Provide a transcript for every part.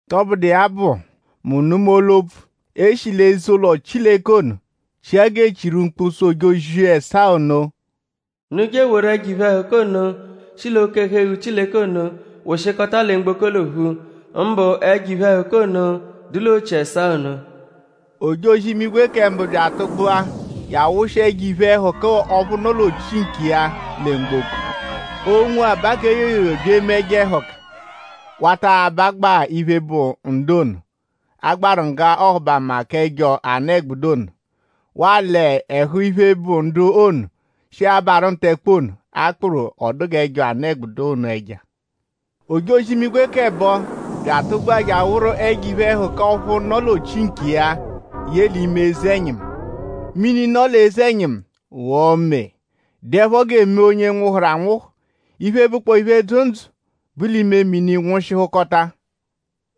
Tọbudu iya bụ; mu nụma olu-opfu, e shi l'ime eze-ụlo Chileke ono chia g'e chiru mkpu sụ ojozi ẹsaa ono: “Unu je eworu ẹjo iphe-ẹhuka ono, shi l'oke-ẹhu-eghu Chileke ono wụshikota lẹ mgboko l'ophu; mbụ ẹjo iphe-ẹhuka ono, dụ l'ochi ẹsaa ono.” Ojozi-imigwe kẹ mbụ bya atụgbua je awụshia ẹjo iphe-ẹhuka ọphu nọ l'ochi nkiya lẹ mgboko. Onwo, aba yoyoyo bya eme ẹjo ẹhuka; wata abagbaa iphe, bụ ndu ono, a gbaru ngga ọhubama k'ẹjo anụ-ẹgbudu ono; waa l'ẹhu iphe, bụ ndu ono, shi abarụ ntẹkpe ono, a kpụru ọ dụ g'ẹjo anụ-ẹgbudu ono ẹja. Ojozi-imigwe k'ẹbo bya atụgbua je awụru ẹjo iphe-ẹhuka ọphu nọ l'ochi nkiya ye l'ime eze-ẹnyimu. Mini, nọ l'eze-ẹnyimu ghọo mee; dụepho gẹ mee onye nwụhuru anwụhu. Iphe, bụkpoo iphe, dzụ ndzụ, bu l'ime mini nwụshihukota.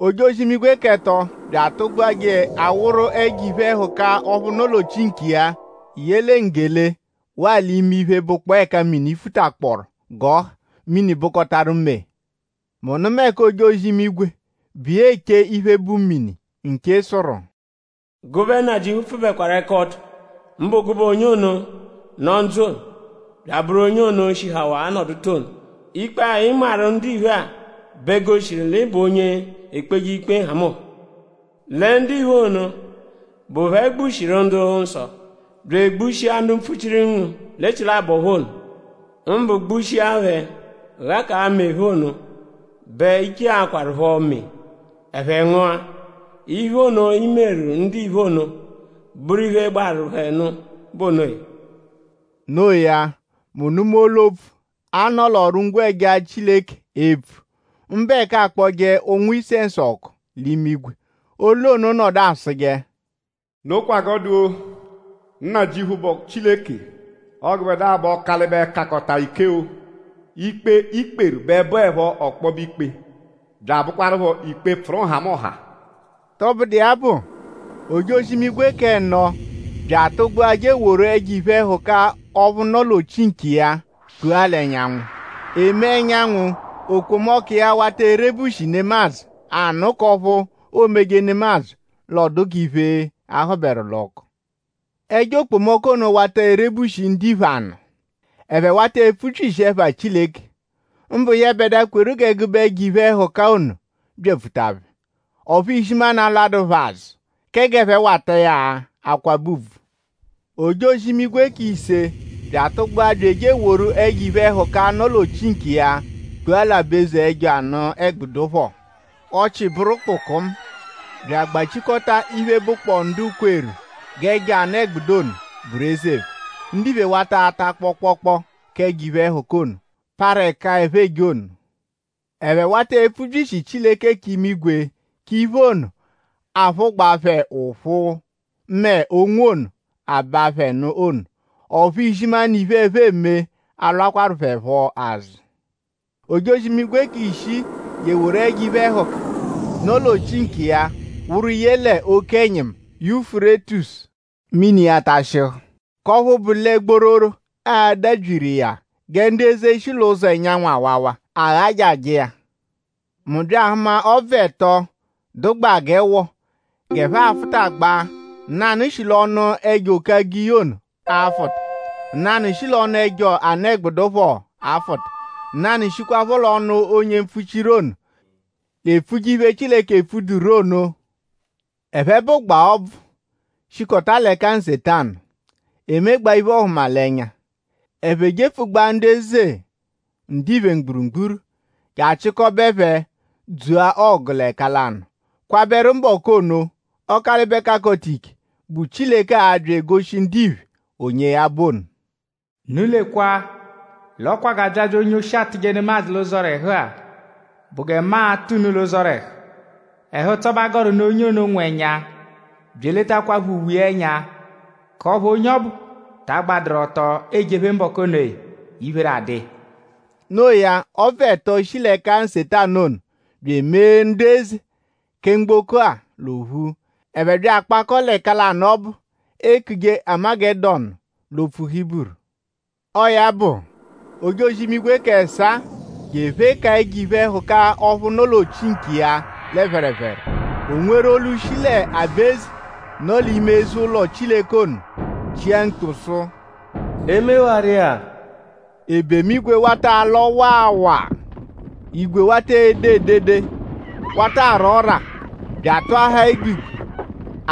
Ojozi-imigwe k'ẹto bya atụgbua je awụru ẹjo iphe-ẹhuka ọphu nọ l'ochi nkiya ye lẹ nggele waa l'ime iphe, bụ ẹka mini futakpọoru g'ọ ha. Mini bụkotaru mee. Mu nụma ẹka ojozi-imigwe, bụ iya eche iphe, bụ mini nche sụru: “Gụbe Nnajịuphu pfụbekwaru ẹka ọto; mbụ gụbe onye ono, nọ ndzụ; bya abụru onye ono, shihawaa nọduta ono. Ikpe-a, ị nmarụ ndiphe-a bẹ goshiru l'ị bụ onye ekpeje ikpe nhamụnha. Lẹ ndiphe ono, bụ phẹ gbushiru ndu-nsọ bya egbushia ndu mpfuchiru ngu l'echilabọ phẹ ono; mbụ gbushia phẹ ghakaa mee phẹ ono bẹ i cheakwarụpho mee; ẹphe ngụa. Iphe ono, i meru ndiphe ono bụru iphe, gbaru phẹ nụ bụ onoya.” No iya; mu nụma olu-opfu, a nọ l'ọru-ngwẹja Chileke epfu; mbụ ẹka aakpọje ụ̀nwù-isẹnsu ọku l'imigwe. Olu ono nọdu asụje: “Nokwa g'ọ dụ-o! Nnajịuphu, bụ Chileke; ọo gụbedua bụ Ọkalibe-Kakọta-Ike-o. Ikpe, i kperu bẹ bụepho ọkpobe ikpe bya abụkwarupho ikpe, pfụru nhamụnha.” Tọbudu iya bụ; ojozi-imigwe k'ẹno bya atụgbua je eworu ẹjo iphe-ẹhuka ọphu nọ l'ochi nkiya kpua l'ẹnyanwu. E mee ẹnyanwu; okpomọku iya wata erebushi nemadzụ anụ k'ọphu oomeje nemadzụ l'ọo dụ g'iphe, a hụberu l'ọku. Ẹjo okpomọku ono wata erebushi ndiphe anụ. Ẹphe wata epfubyishi ẹpha Chileke; mbụ yẹbedua, kweru g'ẹgube ẹjo iphe-ẹhuka ono byapfuta phẹ. Ọphu izimanụ alwadụru phẹ azụ kẹ g'ẹphe wata iya akwabẹ ùbvù. Ojozi-imigwe k'ise bya atụgbua bya eje eworu ẹjo iphe-ẹhuka, nọ l'ochi nkiya kpua l'aba-eze ẹjo anụ-ẹgbudu phọ. Ọchii bụru kpukumu bya agbachikọta iphe, bụkpoo ndu kweru g'ẹjo anụ-ẹgbudu ono bụru eze phẹ. Ndiphe wata ata kpọokpookpo k'ẹjo iphe-ẹhuka ono, parụ ẹka ẹphe eje ono. Ẹphe wata epfubyishi Chileke k'imigwe k'iphe ono, aphụgbaa phẹ ụphu mẹ onwo ono, aba phẹ nụ ono. Ọphu izimanụ iphe, ẹphe eme alwakwaru phẹ phọ azụ. Ojozi-imigwe k'ishii je eworu ẹjo iphe-ẹhuka, nọ l'ochi nkiya wụru ye l'oke-ẹnyimu Yufurétisu. Mini iya tashịhu; k'ọphu bụ lẹ gbororo a-dabyiru iya gẹ ndu eze, shi l'ụzo ẹnyanwu awawa aghajajẹ iya. Mu bya ahụma ọbvu ẹto, dụgbaa g'ẹwo g'ẹphe afụtagbaa. Nanụ shi l'ọnu ẹjo-oke-agiyi ono afụta; nanụ shi l'ọnu ẹjo anụ-ẹgbudu phọ afụta; nanụ shikwaphọ l'ọnu onye mpfuchiru ono, l'epfuje iphe, Chileke epfuduru ono. Ẹphe bụgbaa ọbvu, shikọta l'ẹka Nsetanu; emegbaa iphe-ọhumalenya. Ẹphe jepfugbaa ndu eze ndiphe mgburugburu je achịkobe phẹ dzua ọgu l'ẹka lanụ kwabẹru mbọku ono, Ọkalibe-Kakọta-Ike, bụ Chileke a-bya egoshi ndiphe onye ya bụ ono. “Unu lekwa l'ọ kwa g'abyabya onye-oshi atụje nemadzụ l'ụzorehu-a bụ gẹ mu a-tụ unu l'ụzorehu. Ẹhu-ụtso bẹ a gọru nụ onye ono, nwụ ẹnya bya eletakwaphọ uwe iya ẹnya; k'ọphu onye ọbu taa gbadụru ọto ejephe mbọku onoya; iphere adụ iya.” No iya; ọbvu ẹto ono, shi l'ẹka Nsetanu ono bya emee ndu eze kẹ mgboko-a l'ophu: ẹphe bya akpakọo l'ẹka lanụ ọbu, eekuje Amagẹdonu l'opfu Hiburu. Ọo ya bụ; ojozi-imigwe k'ẹsaa je ephekaa ẹjo iphe-ẹhuka ọphu nọ l'ochi nkiya lẹ phẹrephere. O nweru olu, shi l'aba-eze, nọ l'ime eze-ụlo Chileke ono chia mkpu sụ: “E mewaru iya!” Ebemu-igwe wata alọ waa waa. Igwe wata ede edede; wata ara ọ́rà; bya atụahaa egbigwe.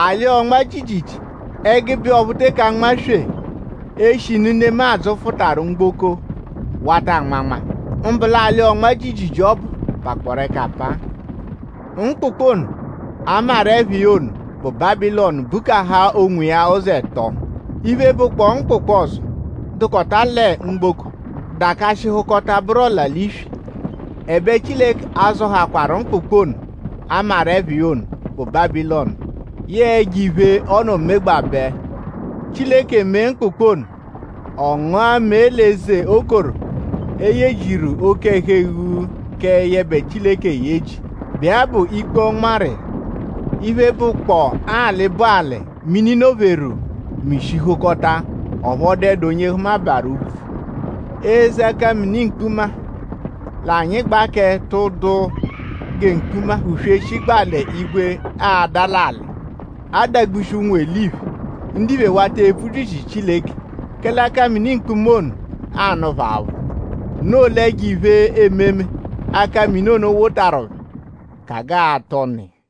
Alị-ọnma-jiijiijii ẹgube iya ọphu eteke anmaswee; eshinu nemadzụ fụtaru mgboko wata anmanma; mbụ l'alị-ọnma-jiijiijii ọbu pakpọoru ẹka apaa. Mkpụkpu ono, a maru ẹpha iya ono, bụ Bábilọnu bukaha onwiya uzi ẹto. Iphe, bụkpoo mkpụkpu ọzo, dụkota lẹ mgboko dakashịhukota bụru ọla-l'iswi. Ẹbe Chileke azọhakwaru mkpụkpu ono, a maru ẹpha iya ono, bụ Bábilọnu; yẹe ẹjo-iphe, ọ nọ megbabẹ. Chileke mee mkpụkpu ono: ọ ngụa mẹe l'eze okoro, e yejiru oke-ẹhu-eghu kẹ yẹbe Chileke eyeji, bụ iya bụ ikpe ọ nmarụ iya. Iphe, bụkotakpoo alị, bụ alị, mini nọ-pheru mishihukọta. Ọphu ọ dụedu onye hụmabaaru úbvú. Eze akamini-mkpuma, l'anyịgbaa kẹ tụ́dúú gẹ mkpuma-uswe shigbaa l'igwe aada l'alị; adagbushi ụnwu-eliphe. Ndiphe wata epfubyishi Chileke; kẹle akamini-mkpuma ono anụ phẹ aphụ. Noo l'ẹjo iphe-ememe, akamini ono wotaru phẹ ka g'aa-atụ ọnu iya.